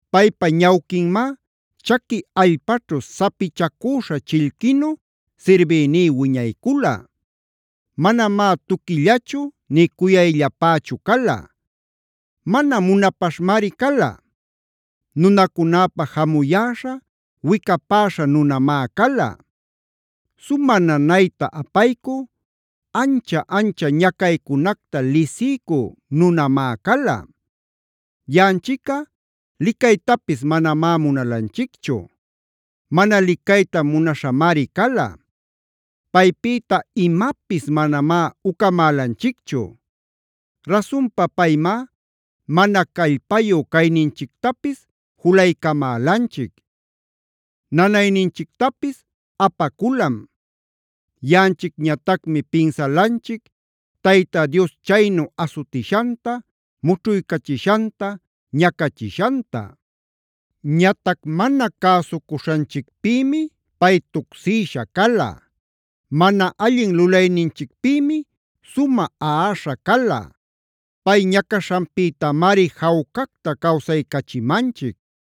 Paypa ñawquinmá chaqui allpaćhu sapichacüśha chillquinu sirbïní wiñaycula. Manamá tuquillachu nï cuyayllapächu cala. Mana munapaśhmari cala. Nunacunäpa jamuyäśha, wicapäśha nunamá cala.c Sumä nanayta apaycü, ancha-ancha ñacaycunacta lisiycü nunamá cala. Yaꞌanchicꞌa licaytapis manamá munalanchicchu. Mana licayta munaśhamari cala; paypïta imapis manamá ucamälanchicchu. Rasunpa paymá mana callpayu cayninchictapis julaycamälanchic. Nanayninchictapis apaculam.d Yaꞌanchicñatacmi pinsalanchic Tayta Dios chaynu asutishanta, mućhuycachishanta, ñacachishanta. Ñatac mana cäsucuśhanchicpïmi pay tucsïsha cala; mana allin lulayninchicpïmi sumä aꞌaśha cala. Pay ñacaśhanpïtamari jawcacta cawsaycachimanchic;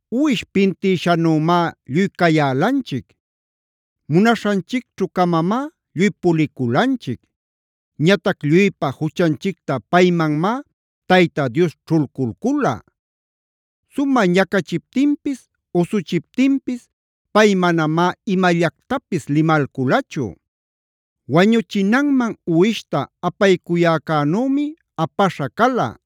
Uwish pintïshanümá lluy cayälanchic;f munaśhanchicćhu-camamá lluy puliculanchic. Ñatac lluypa juchanchicta paymanmá Tayta Dios ćhulculcula. Sumä ñacachiptinpis, usuchiptinpis pay manamá imallactapis limalculachu. Wañuchinanman uwishta apaycuyäcänümi apaśha cala.g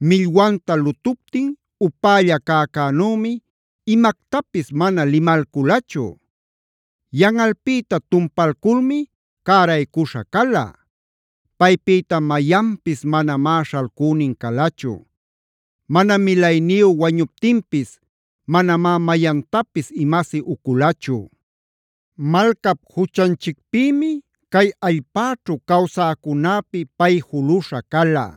Millwanta lutuptin upälla cäcänümi imactapis mana limalculachu. Yanꞌalpïta tumpalculmi cäraycuśha cala. Paypïta mayanpis manamá śhalcünin calachu; mana milayniyu wañuptinpis manamá mayantapis imasi uculachu. Malcap juchanchicpïmi cay allpäćhu cawsäcunäpi pay juluśha cala;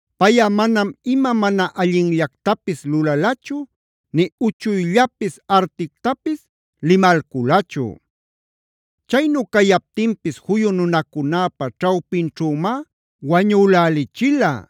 Payꞌa manam ima mana allinllactapis lulalachu, nï uchuyllapis artictapis limalculachu. Chaynu cayaptinpis juyu nunacunäpa ćhawpinćhümá wañülälichila;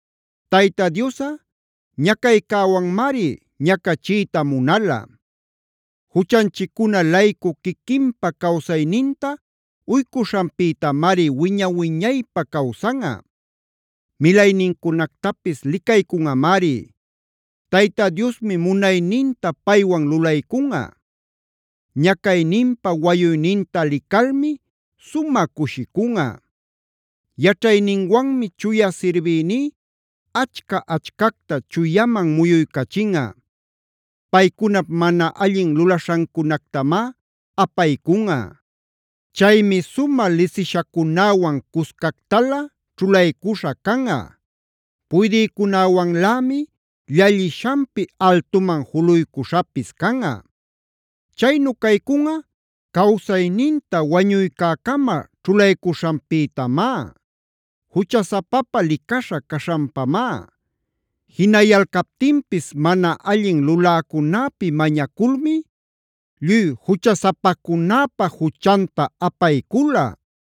Tayta Diosꞌa ñacaycäwanmari ñacachiyta munala. Juchanchiccuna-laycu quiquinpa cawsayninta uycuśhanpïtamari wiña-wiñaypä cawsanꞌa; milaynincunactapis licaycunꞌamari. Tayta Diosmi munayninta paywan lulaycunꞌa. Ñacayninpa wayuyninta licalmi sumä cushicunꞌa. Yaćhayninwanmi chuya sirbïní achca-achcacta chuyaman muyuycachinꞌa; paycunap mana allin lulaśhancunactamá apaycunꞌa. Chaymi sumä lisishacunäwan cuscactalä ćhulaycuśha canꞌa; puydïcunäwanlämi llallishanpi altuman juluycuśhapis canꞌa. Chaynu caycunꞌa cawsayninta wañuycäcama ćhulaycuśhanpïtamá; juchasapapä licaśha caśhanpamá.j Jinayalcaptinpis mana allin luläcunäpi mañaculmi lluy juchasapacunäpa juchanta apaycula.